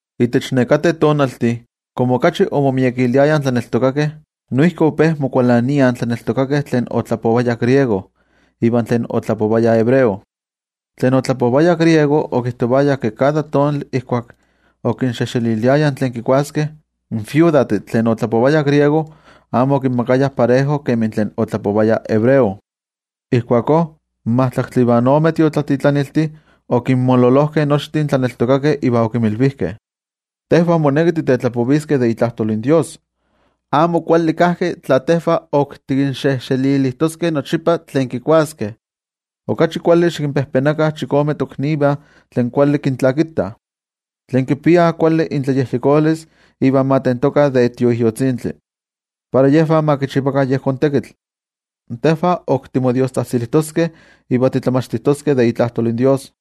Itech nekateh tonaltih, komo okachi omomiekiliayah in tlaneltokakeh, noijki ope mokualaniah in tlaneltokakeh tlen otlapovayah griego iva tlen otlapovayah hebreo. Tlen otlapovayah griego okijtovayah ke kada tonali ijkuak okinxejxeliliayah tlen kikuaskeh, in iknosivameh tlen otlapovayah griego amo okinmakayah parejo kemi tlen otlapovayah hebreo. Ijkuakó in majtlaktli ivan ome tiotlatitlaniltih okinmololojkeh nochtin tlaneltokakeh iva okinmilvijkeh: —Tejvah moneki titetlapoviskeh de itlajtol in toYejwatzi. Amo kuali kajki tla tejvah ok tikinxejxelilijtoskeh nochipa tlen kikuaskeh. Okachi kuali, xikinpejpenakah chikome toknivah tlen kuali kintlakitah, tlen kipiah kuali intlayejyekolis iva ma tentokah de Tioijyotzintli, para yejvah ma kichivakah yejón tekitl. Tejvah timotemaktiskeh itech diostzajtzilistli iva itech tlamachtilistli de itlajtol in toYejwatzi.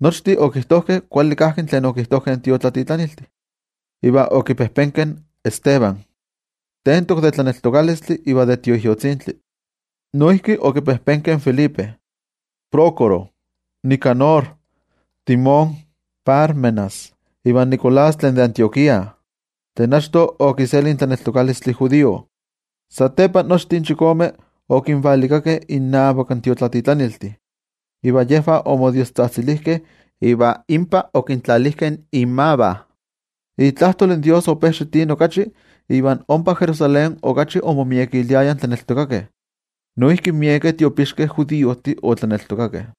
Nochtin okijtojkeh kuali kajki tlen okijtojkeh in tiotlatitlaniltih, iva okipejpenkeh in Esteban, tentok de tlaneltokalistli iva de Tioijyotzintli, noijki okipejpenkeh in Felipe, Prócoro, Nicanor, Timón, Pármenas ivan Nicolás tlen de Antioquía, tlen achto okiselijka in tlaneltokalistli judío. Satepa nochtin chikome okinvalikakeh innavak in tiotlatitlaniltih, iva yejvah omodiostzajtzilijkeh iva inpa okintlalijkeh inmavah. Itlajtol in Dios ope xitini okachi, iva ompa Jerusalén okachi omomiekiliayah in tlaneltokakeh. Noijki miekeh tiopixkeh judiojtih otlaneltokakeh.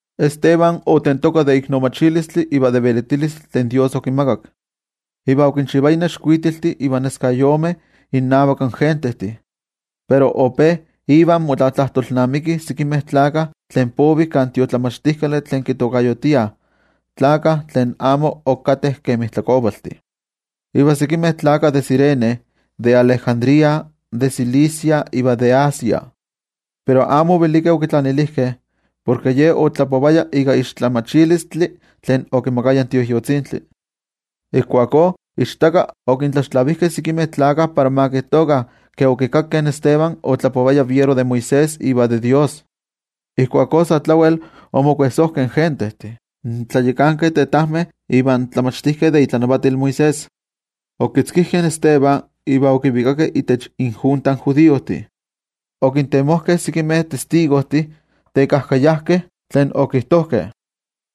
Esteban otentokah de iknomachilistli iva de velitilistli tlen Dios okimakak, iva okinchivaya nexkuitiltih iva neskayomeh innavak in gentejtih. Pero ope ivan motlatlajtolnamikih sekimeh tlakah tlen povih kan tiotlamachtijkali tlen kitokayotiah Tlakah Tlen Ayakmo Ok Kateh Kemi Tlakovaltih, iva sekimeh tlakah de Cirene, de Alejandría, de Cilicia iva de Asia. Pero amo ovelikeh okitlanilijkeh, porke ye otlapovaya ika tlamatilistli tlen okimakaya in Tioijyotzintli. Ijkuakó ichtaka okintlaxtlavijkeh sekimeh tlakah para ma kijtokah ke okikakkeh in Esteban otlapovaya fiero de Moisés iva de Dios. Ijkuakó sa tlawel omokuejsojkeh in gentejtih, in tlayakankeh tetajmeh ivan tlamachtijkeh de itlanavatil Moisés. Okitzkijkeh in Esteban iva okivikakeh itech injunta in judiojtih. Okintemojkeh sekimeh testigojtih tekajkayajkeh, tlen okijtojkeh: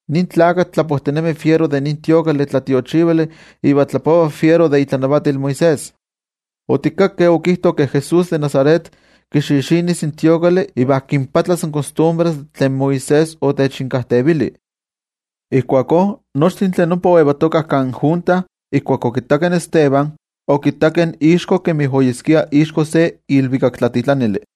—Nin tlakatl tlapojtinemi fiero de nin templo tlatiochivali iva tlapova fiero de itlanavatil Moisés. Otikakkeh okijto ke Jesús de Nazaret, kixixinis in templo iva kinpatlas in kostumbres tlen Moisés otechinkajtevili. Ijkuakó nochtin tlen ompa oyetokah kan junta, ijkuak okittakeh in Esteban, okittakeh ixko kemi oyeskia ixko se ilvikaktlatitlanili.